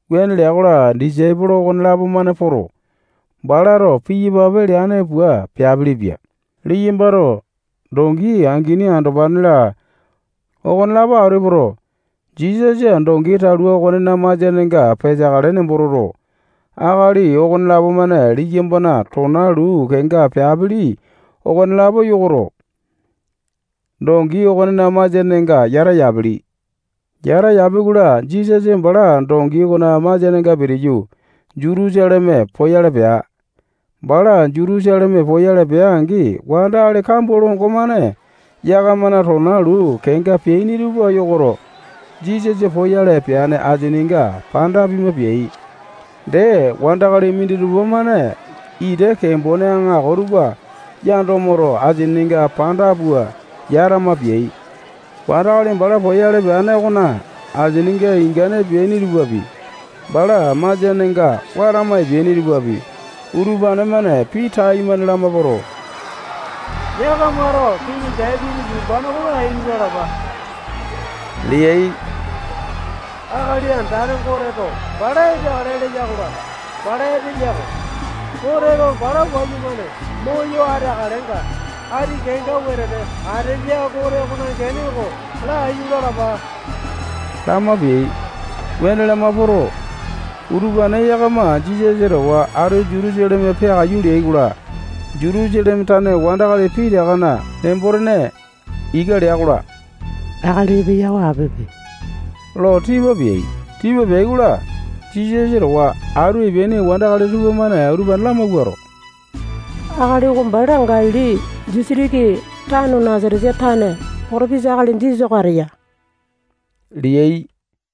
Wuane lea-kola, disaipolo okonelapo-mane poto, balato piyapape leane pua peapilipia. Liyambato dongi angini, andopane-la, okonelapo atu epoto, Jisasa dongi talua okonena masianenga peteakale nembo toto, akali okonelapo-mane liyambana tona luu kenga peapili okolapo yokoto, dongi okonena masianenga yata yapili. Yata yapi-kola, Jisasa bala dongi okona masianenga pitiyu, Jutusaleme poyale pea. Bala Jutusaleme poyale pea-angi, wandakali kambua longo-mane yakamana tona luu kenga peaini tupa yokoto, Jisasa poyale peane asininga panda pima peai. Dee, wandakali minditupa-mane ita kembone aŋako tupa yando moto, asininga panda pua yatama peai. Wandakali bala poyale peane okona asininga ingane peaini tupapi, bala masianenga watama epeaini tupapi, utupane-mane pii taimane lama poto, yakamato kiŋi Dapiti yumbane oko laiyu lalapa leai. Akali Andane Goteto bala epeakale leya-kola, bala epeya-ko. Goteto bala wayumane moyo ateakalenga, ati kenga wetete ateya Gote okona gene oko laiyu lalapa lama peai. Wuane lama poto, utupane yakama Jisasa towa atu Jutusaleme peakaiyu leai-kola, Jutusaleme tane wandakali pitakana nembo-tene ika lea-kola, akali epeya oko apipe lo tipa peai. Tipa peai-kola, Jisasa towa atu epeaini wandakali tupamane utupane lamawuato, akali oko bala Galili disitiki tano Nasatesa tane potopesa akali Jisasa oko ateya leai.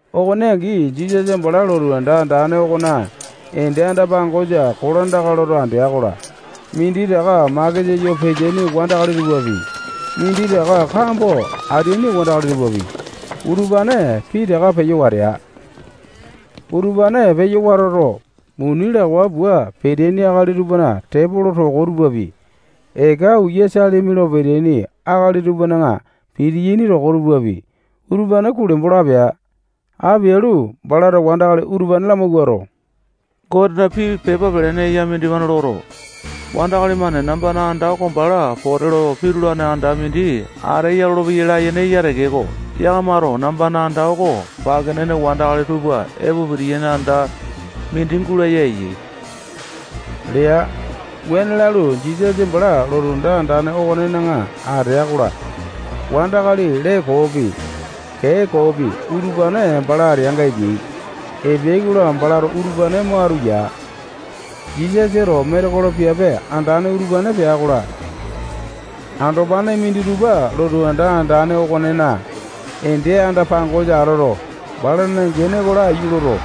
Okone angi, Jisasa bala lotu anda andane okona ende anda-pangosa kolandaka loto andea-kola, minditaka makesa yo peteaini wandakali tupapi, minditaka kambo ateaini wandakali tupapi, utupane pitaka peyo watea. Utupane peyo watoto, muni lawa pua peteaini akali tupana tepolo toko tupapi, eka uya salimi lo peteaini akali tupana pitiyaini toko tupapi, utupane kulembo lo apea. Apialu, balato wandakali utupane lamawuato, Gotena pii pepa pelene eya mindimane loto, wandakali-mane nambana anda oko bala pote lo pitulane anda mindi ateya lolopeyai layene eya tekeko, yakamato nambana anda oko pake nene wandakali tupa epo pitiyaini anda mindi gulaya eyai lea. Wuane lalu, Jisasa bala lotu anda andane okonena atea-kola, wandakali lee koopi, kee koopi, utupane bala ateanga epeai. Epeai-kola, balato utupane mo atu ya. Jisasato metekolo piape andane utupane pea-kola, andopane minditupa lotu anda andane okonena ende anda-pangosa atoto, balana gene oko laiyu loto,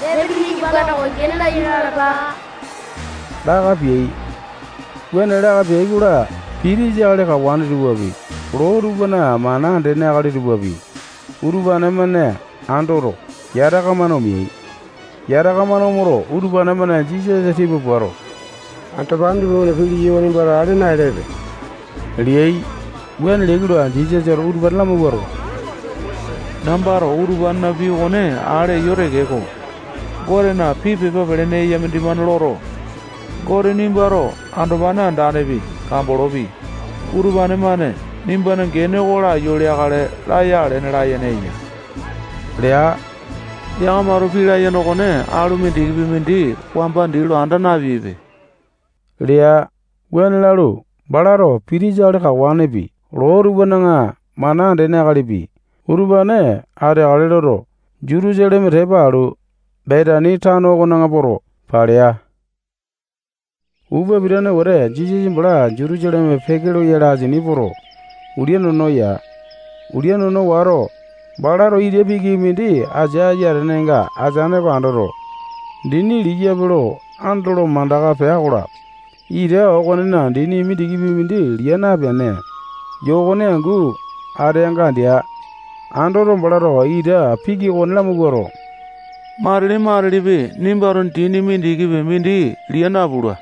Dapitina yumbane oko laiyu lalapa, laka peai. Wuane laka peai-kola, pitisa akali kawane tupapi, loo tupana mana andene akali tupapi, utupane-mane andoto, yataka-mane omeai. Yataka-mane omoto, utupane-mane Jisasa tipa puato, andopane tupamane pii leyai okone nimbato ale naelepe leai. Wuane leai-kola, Jisasato utupane lamawuato, nambato utupanena pii okone ale eyo tekeko, Gotena pii pepa pelene eya mindimane loto, Gote nimbato andopane andanepi, kambolopi, utupane-mane nimbana gene oko laiyu leakale laya alene layene eya lea. Yakamato pii layene okone alu mindikipi mindi wamba dii lo anda napeaipe lea. Wuane lalu, balato pitisa akali kawanepi, loo tupana mana andene akalipi, utupane ateakale loto, Jutusaleme tepa alu, Betani tano okona poto, palea. Upa pitane wete Jisasa bala Jutusaleme peke loyale asini poto, ulia nono ya. Ulia nono wato, balato ita piki mindi asia ayatenenga ateane oko andoto, dini liyape lo andolo mandaka pea-kola, ita okonena dini mindikipi mindi lia napene, yokone angu ateanga andea. Andoto, balato ita piki okone lamawuato, matili-matilipi nimbato dini mindikipi mindi lia napula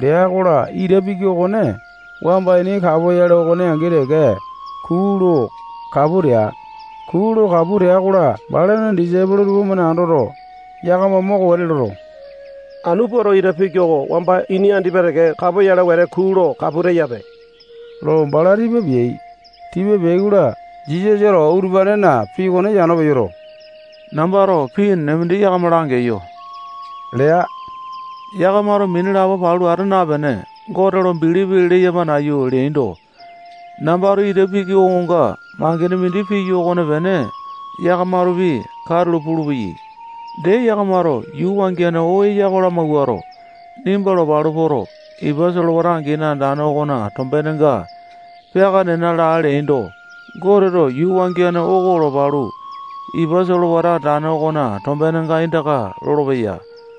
lea-kola, ita piki okone wamba ini kapoyale okone angi teke kuu lo kapu tea. Kuu lo kapu tea-kola, balana disaipolo tupamane andoto, yakama moko wete loto, anu puato ita piki oko wamba ini andipa teke kapoyale wete kuu lo kapu teyape lo bala tipa peai. Tipa peai-kola, Jisasato utupanena pii okone yano peyoto, nambato pii enene mindi yakama langeyo lea. Yakamato mini lapo palu ata napene, Gote lo bilipi leyama nayu leaindo, nambato ita piki okonga mangene mindi piyo okopene yakamatopi katulo pulupeyai. Dee, yakamato yuu wangiane oo eya oko lamawuato, nimba lopalu poto, ipa solewata angini andane okona tombenenga peaka nena laa leaindo, Goteto yuu wangiane oko lopalu, ipa solewata andane okona tombenenga aindaka lolopeya.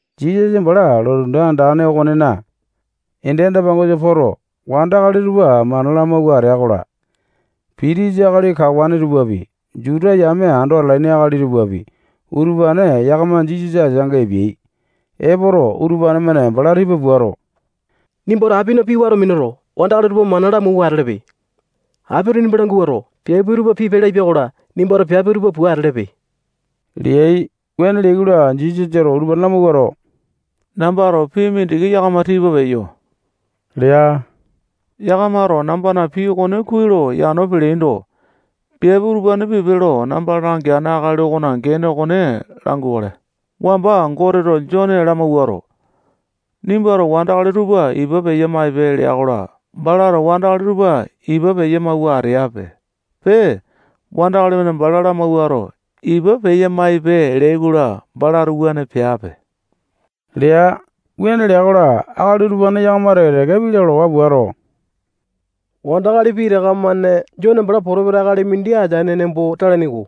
Jisasa bala lotu anda andane okonena ende anda-pangosa poto, wandakali tupa mana lamawua atea-kola, pitisa akali kawane tupapi, Juta yame ando atalaini akali tupapi, utupane yakama Jisasa ateanga epeai. Epoto, utupane-mane bala tipa puato, nimbato apina pii wato minuto, wandakali utupa mana lamawua atelepe. Apito nimba languato, piape utupa pipe lapia-kola, nimbato piape utupa pua atelepe leai. Wuane leai-kola, Jisasato utupane lamawuato, nambato pii mindiki yakama tipa peyo lea. Yakamato nambana pii okone kuai lo yano peleaindo, piape utupane pipe lo namba langeane akali okona gene oko langukale. Wamba Goteto Jone lamawuato, nimbato wandakali tupa ipa peya-maipe lea-kola, balato wandakali tupa ipa peya-mauwa ateape. Pee, wandakali-mane bala lamawuato, ipa peya-maipe leai-kola, balato wuane peape lea. Wuane lea-kola, akali utupane yakama teke-teke pii lalawa puato, wandakali pitaka-mane Jone bala potopesa akali mindi ateane nembo talaini-ko.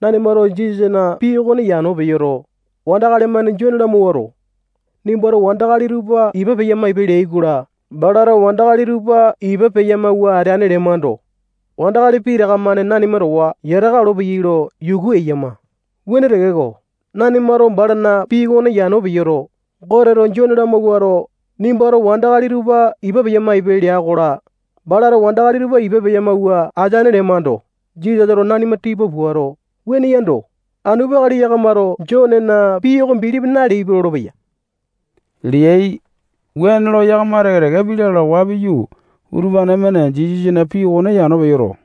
Nanimato Jisasana pii okone yano peyoto, wandakali-mane Jone lamawuato, nimbato wandakali tupa ipa peya-maipe leai-kola, balato wandakali tupa ipa peya-mawua ateane lemando, wandakali pitaka-mane nanima towa yataka olopeyai lo yuku eyama. Wuane tekeko, nanimato balana pii okone yano peyoto, Goteto Jone lamawuato, nimbato wandakali tupa ipa peya-maipe lea-kola, balato wandakali tupa ipa peya-mawua ateane lemando, Jisasato nanima tipa puato, wuane yando, anu peakale yakamato Jonena pii oko bilipi naleaipe lolopeya leai. Wuane lo yakama teke-teke pii lalawa piyu, utupane-mane Jisasana pii okone yano peyoto,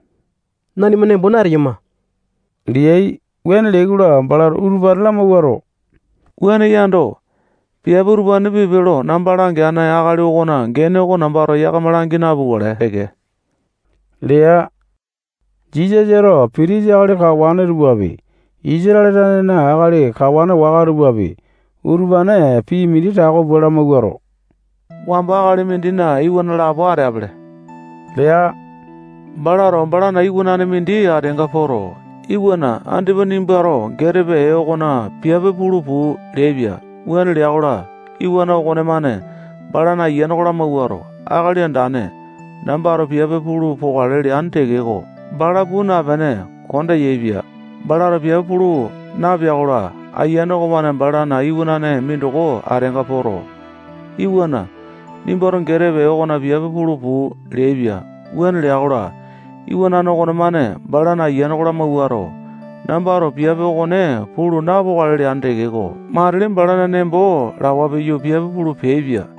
nanima nembo nateyama leai. Wuane leai-kola, balato utupane lamawuato, wuane yando, piape utupa pipe lo namba langeane akali okona gene oko nambato yakama langi napukale teke lea. Jisasato pitisa akali kawane tupapi, Isatale tanena akali kawane waka tupapi, utupane pii mindi tako pua lamawuato, wamba akali mindina iwana lapo ateapele lea. Balato balana iwanane mindi ateanga poto, iwana, andipa nimbato getepe ee okona piape pulu puu leaipia. Wuane lea-kola, iwana okonemane balana ayiane lamawuato, akali andane, nambato piape pulu pokale leane tekeko, bala puu napene, konda yaepia. Balato piape pulu napea-kola, ayiane okomane balana iwanane mindoko ateanga poto, iwana, nimbato getepe ee okona piape pulu puu leaipia. Wuane lea-kola, iwanane okonemane balana ayiane lamawuato, nambato piape okone pulu napokale leane tekeko, matili balana nembo lawa piyu, piape pulu peaipia.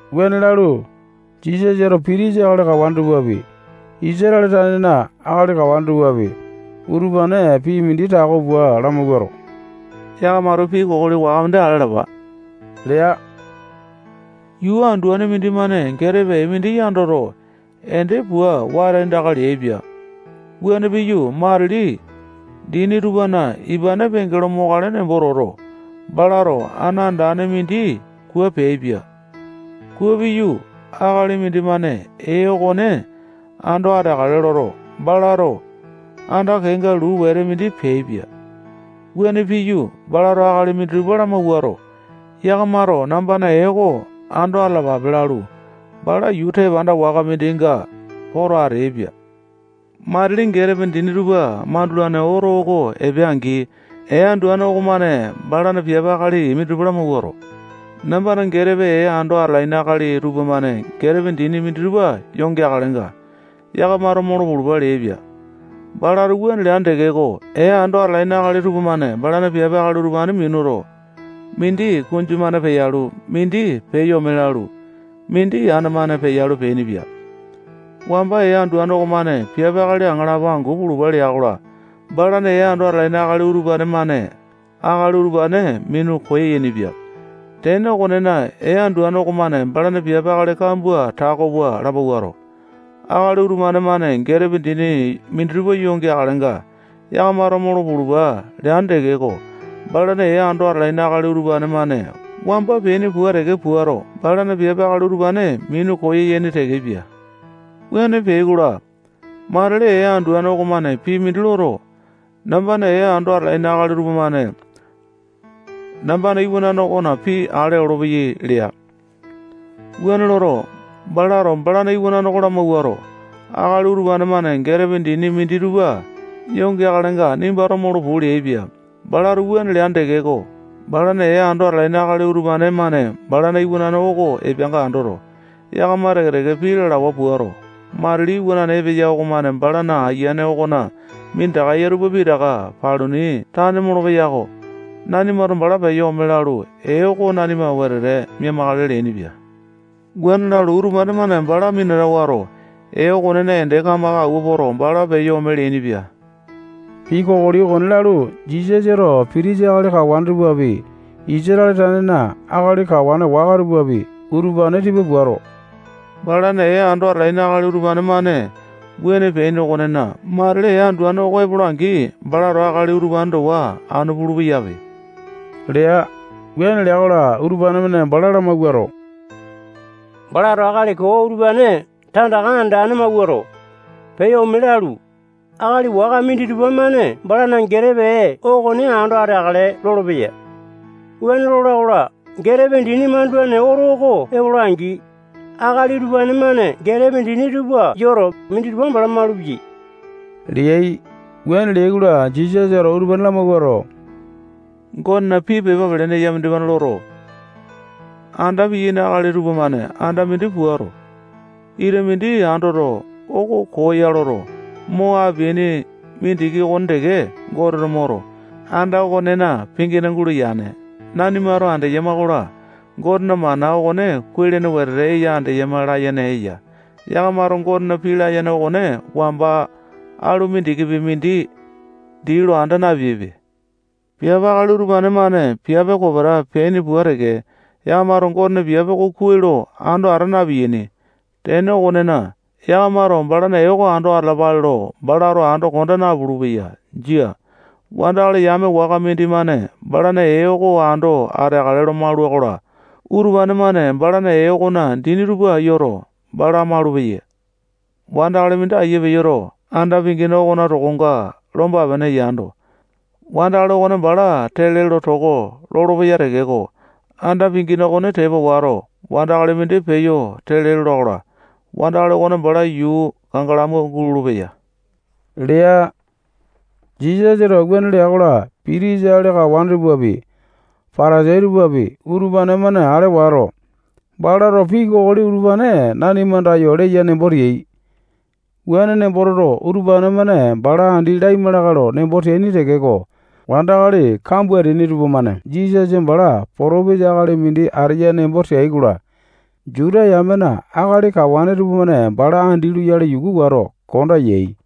Wuane lalu, Jisasato pitisa akali kawane tupapi, Isatale tanena akali kawane tupapi, utupane pii mindi tako pua lamawuato, yakamato pii kokoli waka mindi ale alapa lea. Yuu anduane mindimane getepe ee mindi yandoto, ende pua wata aindaka leaipia. Wuane piyu, matili dini tupana ipane penge lo mokale nembo toto, balato ana andane mindi kua peaipia. Kua piyu, akali mindimane ee okone ando ateakale loto, balato anda kenga luu wete mindi peaipia. Wuane piyu, balato akali minditupa lamawuato, yakamato nambana ee oko ando atalapape lalu, bala yuu tepanda waka mindinga poto ateaipia. Matili getepe dini tupa mandulane oto oko epea-angi, ee anduane okomane balana piape akali minditupa lamawuato, nambana getepe ee ando atalaini akali tupamane getepe dini minditupa yo geakalenga, yakamato molo pulupa leaipia. Balato wuane leane tekeko, ee ando atalaini akali tupamane balana piape akali utupane minuto, mindi kunju-mane peyalu, mindi peyo ome lalu, mindi ana-mane peyalu, peainipia. Wamba ee anduane okomane piape akali aŋalapo angu pulupa lea-kola, balana ee ando atalaini akali utupane-mane akali utupane minu koyainipia. Tene okonena, ee anduane okomane balana piape akali kambua tako pua lamawuato, akali utupane-mane getepe dini minditupa yo geakalenga, yakamato molo pulupa leane tekeko, balana ee ando atalaini akali utupane-mane wamba peaini pua teke puato, balana piape akali utupane minu koyaini tekepia. Wuane peai-kola, matili ee anduane okomane pii mindi loto, nambana ee ando atalaini akali utupane-mane nambana iwanane okona pii ale olopeyai lea. Wuane loto, balato balana iwanane oko lamawuato, akali utupane-mane getepe dindi minditupa yo geakalenga, nimbato molo puu leaipia. Balato wuane leane tekeko, balana ee ando atalaini akali utupane-mane balana iwanane oko epeanga andoto, yakama teke-teke pii lalawa puato, matili iwana epeya okomane bala ayiane okona minditaka eya tupa pitaka paluni tane molopeya-ko. Nanimato bala peyo ome lalu, ee oko nanima wetete mia-makale leainipia. Wuane lalu, utupane-mane bala minata wato, ee okonena ende kamaka awua poto, bala peyo ome leainipia. Pii kokoli okone lalu, Jisasato pitisa akali kawane tupapi, Isatale tanena akali kawane waka tupapi, utupane tipa puato, balana ee ando atalaini akali utupane-mane wuane peaini okonena, matili ee anduane oko epola-angi, balato akali utupane towa anu pulu-peyape lea. Wuane lea-kola, utupane-mane bala lamawuato, balato akali koo utupane tandaka andane mawuato, peyo ome lalu, akali waka minditupa-mane balana getepe ee okone ando ateakale lolopeya. Wuane lola-kola, getepe dini mandulane oto oko epola-angi, akali utupane-mane getepe dini tupa yoto, minditupa bala malupeyai leai. Wuane leai-kola, Jisasato utupane lamawuato, Gotena pii pepa pelene eya mindimane loto, anda piyaini akali tupamane anda mindi puato, ita mindi andoto, oko koo ya loto, mo apeaini mindiki okone teke, Goteto moto, anda okonena pingina gulaya yane. Nanimato andeyama-kola, Gotena mana okone kuai-lene wete eya andeyama layene eya. Yakamato Gotena pii layene okone wamba alu mindikipi mindi dii lo anda napeaipe. Piape akali utupane-mane piape kopeta peaini pua teke, yakamato Gotena piape oko kuai lo ando ata na-piyaini. Tene okonena, yakamato balana ee oko ando atalapale lo balato ando konda napulu-peya. Jia. Wandakali yame waka mindimane balana ee oko ando ateakale lo maula-kola, utupane-mane balana ee okona dini tupa yoto, bala maulupeya. [Wandakali mindi aiya peyoto, anda pingina okona tokonga lomba-pene yando, wandakali okone bala tele lo toko lolopeya tekeko, anda pingina okone tepa wato, wandakali mindi peyo tele lola-kola, wandakali okone bala yuu kangalamu gulolo-peya lea]. Jisasato wuane lea-kola, pitisa akali kawane tupapi, Patasai tupapi, utupane-mane ale wato, balato pii kokoli utupane nanima andayo leya nembo teai. Wuane nembo toto, utupane-mane bala andi laima lakae lo nembo teaini tekeko, wandakali kambua ateaini tupamane Jisasa bala potopesa akali mindi ateya nembo teai-kola, Juta yamena akali kawane tupamane bala andi loyale yuku wato, konda yai.